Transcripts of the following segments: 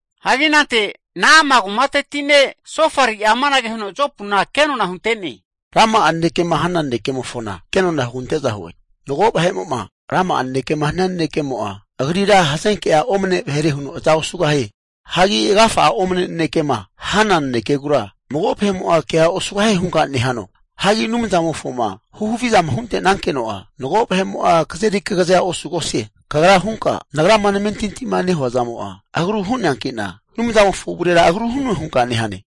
Hagi anante Na'ama kumati ne' Sofari'a amanage huno Jopuna kenona hunte'ne, Rama'a nanekema hana nanekemofona kenona hugante'za hue. Mago vahe'mo'ma rama'a nanekema hania nanekemo'a agrira hazenke'a omne vahere huno aza osugahie. Hagi agafa'a omne nanekema hana nanekegura mago vahe'mo'a kea osugahie hunka nehano? Hagi Anumzamofoma huhavizama hunte'nankeno'a mago vahe'mo'a kazeri kagazea osugosie. Kagra hunka, nagrama namentintima nehua zamo'a agru hu'neanki'na, Anumzamofo avurera agru hu'noe hunka nehane.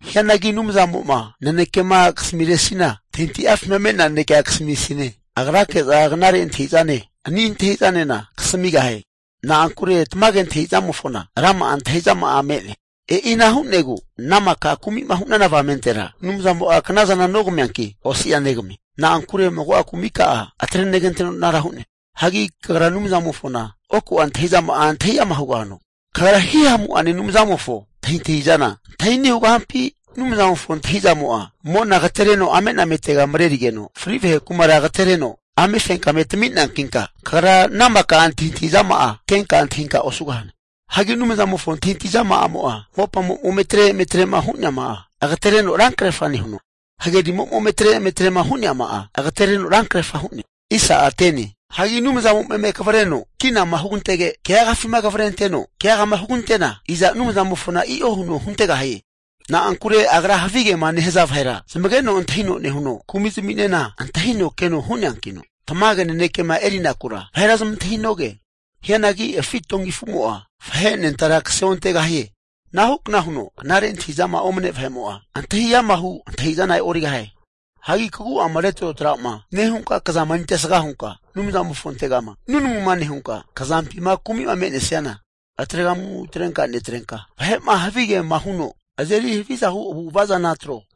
Hianagi Anumzamo'ma nanekema kasamiresina, antahintahi'afima me'nea nanekea kasamisine. Agrake'za knare antahi'zane ani antahi'zanena kasamigahie. Na'ankure tamage antahi'zamofona rama'a antahi'zama'a me'ne. E'ina hu'negu ana maka kumi'ma hu'nana avamentera Anumzamo'a knazana nogamianki, osi'a negamie. Na'ankure mago'a kumika'a atreneganteno anara hu'ne. Hagi kagra Anumzamofona oku'a antahi'zama'a antahi ama' hugahano? Kagra Hihamu'ane Anumzamofo antahintahi'zana, antahi ani' hugahampi? Anumzamofo antahi'zamo'a mona agatereno amenametega marerigeno, fri vahe kumara agatereno (Sheol) amefenkame tami'neankinka kagra ana maka antahintahizama'a kenka antahinka osugahane. Hagi Anumzamofo antahintahi zama'amo'a mopamo'ma ome atre eme atre'ma hu'neama'a agatereno rankrefa nehuno, hagerimo'ma ome atre eme atre'ma hu'neama'a agatereno rankrerfa hu'ne. Hagi Anumzamo'ma eme kavreno kinama hugantege keagafima kavrenteno keagama hugantena iza Anumzamofona i'o huno huntegahie. Na'ankure Agra havigema nehaza vahera zamageno antahino nehuno, kumi'zminena antahino keno hu'neankino tamage nanekema erinakura vahera zamantahinoge. Hianagi afi donki afumo'a vahe anentara kaseontegahie. Ana hukna huno knare antahi'zama omne vahe'mo'a antahi amahu' antahi'zana e'origahie. Hagi kagu'ama retrotra'ma nehunka kazama erintesga hunka Anumzamofontegama nunamuna nehunka, kazampima kumi'ma me'nesiana atregamu atrenka netrenka, vahe'ma havigema huno azeri haviza hu' avu'ava'zana atro.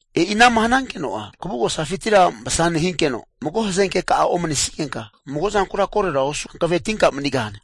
E'inama hanankeno'a kavugosafintira masa nehinkeno, mago hazenkeka'a omnesigenka mago zankura korora osu hankavetinka manigahane.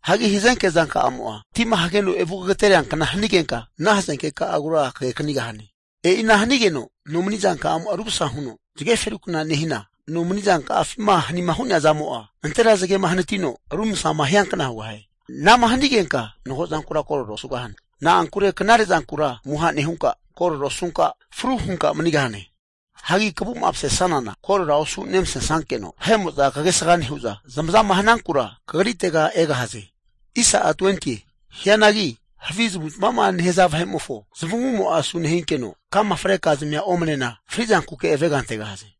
Hagi hazenke zanka'amo'a tima hageno evu kagatereankna hanigenka, ana hazenkeka'agura kageknigahane. E'ina hanigeno nomizankamo'a rumasa huno zage ferukna nehina, nomanizanka'afima hanima hu'nea zamo'a, nantera zagema hanatino rumsama hiankna hugahie. Ana'ma hanigenka mago zankura korora osugosane, na'ankure knare'zankura amuha nehunka, korora osunka fru hunka manigahane. Hagi kavu'ma masesanana korora osu nemasesankeno, vahe'mo'za kagesga nehu'za zamazama hanankura kagritega egahaze. Hianagi havi zamavu'zamava'ma nehaza vahe'mofo zamavumo'a asu nehinkeno, kama frekazmia omnena frizankuke avega antegahaze.